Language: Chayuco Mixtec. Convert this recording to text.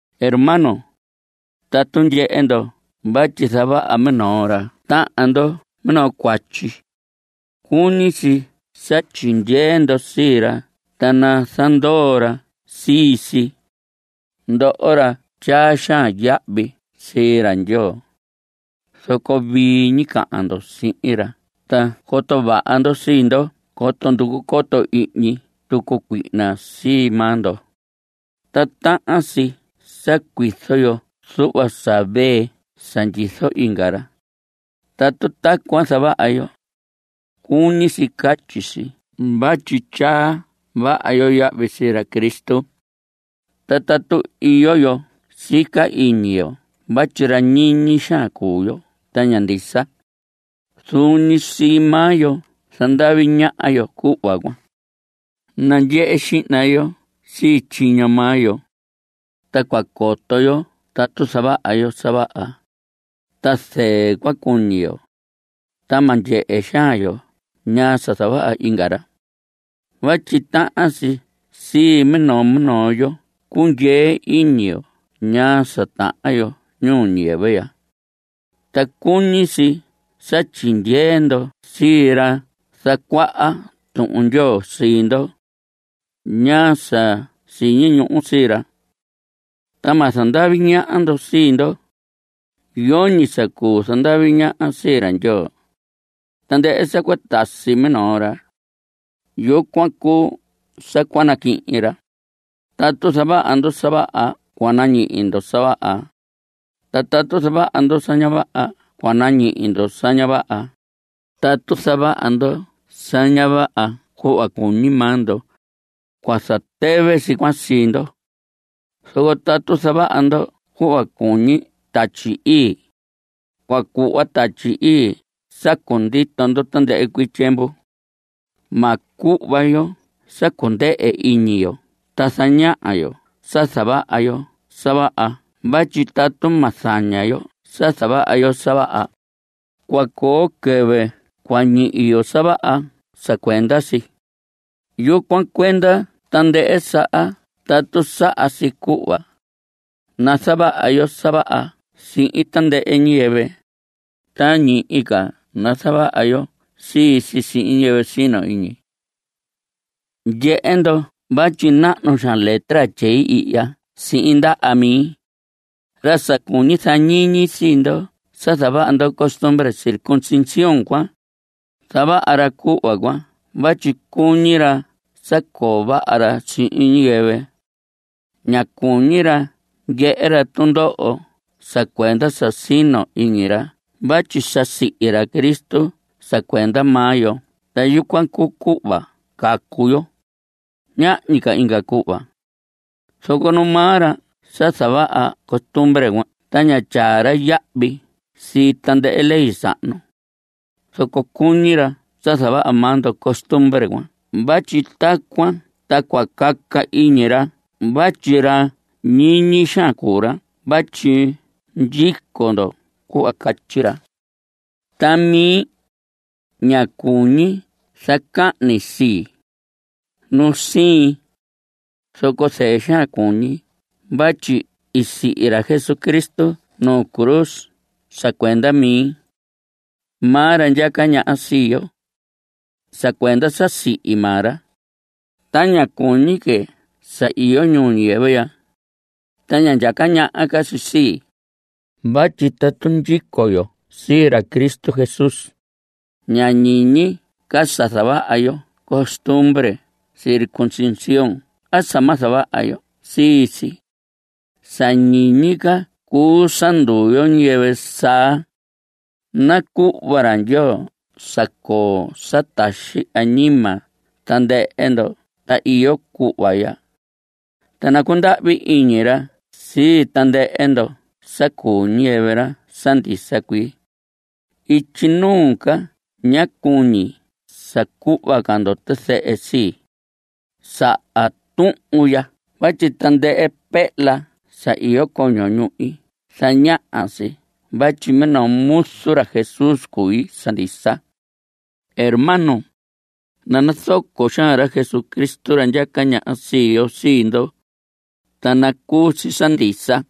Hermanos, tatu ndyehe ndo vatyi zavaha minoo ra tahan ndo minoo cuatyi, cuñi si sa tyindyee ndo sii ra ta nazandoo ra sii si, ndoho ra tyaa xaan yahvi sii ra Ndyoo. Zoco vii ñi cahan ndo sihin ra ta coto vaha ndo sii ndo coto nducu coto ihñi tucu cuihna sii maa ndo. Ta tahan si sa cuizo yo zuhva sa vee sa ndyizo inga ra. Tatu tacuan zavaha yo, cuñi si catyi si vatyi tyaa vaha yo yahvi sii ra Cristo. Ta tatu iyo yo sica iñi yo vatyi ra ñiñi xaan cuu yo ta ña ndisa, zuun ñi sii maa yo zandavi ñaha yo cuhva cuan. Nandyehe xihna yo sii tyiño maa yo, ta cua coto yo tatu zavaha yo sa vaha, ta zɨɨ cua cuñi yo. Ta ma ndyehe xaan yo ñaa sa zavaha inga ra. Vatyi tahan si sii minoo minoo yo cundyee iñi yo ñaa sa tahan yo ñuu ñiyɨvɨ ya. Ta cuñi si sa tyindyee ndo sii ra zacuaha Tuhun Ndyoo sii ndo, ñaa sa siñi ñuhu sii ra. Ta ma zandavi ñaha ndo sii ndo. Yoñi sa cuu zandavi ñaha sii ra Ndyoo. Tandɨhɨ sa cua tasi minoo ra, yucuan cuu sa cua naquihin ra. (Tatu zavaha ndo sa vaha cua nañihi ndo sa vaha, ta tatu zavaha ndo sa ña vaha cua nañihi ndo sa ña vaha.) Tatu zavaha ndo sa ña vaha cuhva cuñi maa ndo, cua zatɨvɨ si cuan sii ndo. Zoco tatu zavaha ndo cuhva cuñi Tatyi Ii, cua cuhva Tatyi Ii sa cundito ndo tandɨhɨ cuii tyiemvu. Ma cuhva yo sa cundɨhɨ iñi yo ta zaña yo sa zavaha yo sa vaha vatyi tatu ma zaña yo sa zavaha yo sa vaha, cua coo quɨvɨ cua ñihi yo sa vaha sa cuenda si. Yucuan cuenda tandɨhɨ saha tatu saha si cuhva, nazavaha yo sa vaha sihin tandɨhɨ ñiyɨvɨ, ta ñihi ca nazavaha yo sii si sihin ñiyɨvɨ sino iñi. Ndyehe ndo vatyi nahnu xaan letra tyei ihya sihin ndaha mi. Ra sa cuñi zañiñi sii ndo sa zavaha ndo costumbre circuncisión cuan, zavaha ra cuhva cuan vatyi cuñi ra sa coo vaha ra sihin ñiyɨvɨ. Ña cuñi ra ndyehe ra tundoho sa cuenda sa sino iñi ra vatyi sa sihi ra Cristo sa cuenda maa yo ta yucuan cuu cuhva cua cacu yo. Ñahñi ca inga cuhva. Zoco nu maa ra sa zavaha costumbre cuan ta ña tyaa ra yahvi sii tandɨhɨ ley sahnu. Zoco cuñi ra sa zavaha maa ndo costumbre cuan vatyi tacuan ta cua caca iñi ra vatyi ra ñiñi xaan cuu ra vatyi ndyico ndo cuhva catyi ra. Ta mi, ña cuñi zacahni sii, nu siin. Zoco zɨɨ xaan cuñi vatyi i sihi ra Jesucristo nu cruz sa cuenda mi. Maa ra ndyaca ñaha sii yo. Sa cuenda sa sihi maa ra, ta ña cuñi que sa iyo ñuu ñiyɨvɨ ya, ta ña ndyaca ñaha ca si sii. Vatyi tatu ndyico yo sii ra Cristo Jesús, ña ñiñi ca sa zavaha yo costumbre circuncisión a sa ma zavaha yo sii si. Sa ñiñi ca cuu sa nduu yo ñiyɨvɨ saa. Ta nacuhva ra Ndyoo sa coo sa taxi añima tandɨhɨ ndoho sa iyo cuhva ya. Ta nacundahvi iñi ra sii tandɨhɨ ndo sa cuu ñiyɨvɨ ra sa ndisa cuii. Ityi nuu ca ña cuñi sa cuhva ca ndo tizɨhɨ sii, saha tuhun ya vatyi tandɨhɨ pehla sa iyo coño ñuhi zañaha si vatyi minoo muzu ra Jesús cui sa ndisa. Hermanos, nanazoco xaan ra Jesucristo, ra ndyaca ñaha sii yo, sii ndo. Ta nacuu si sa ndisa.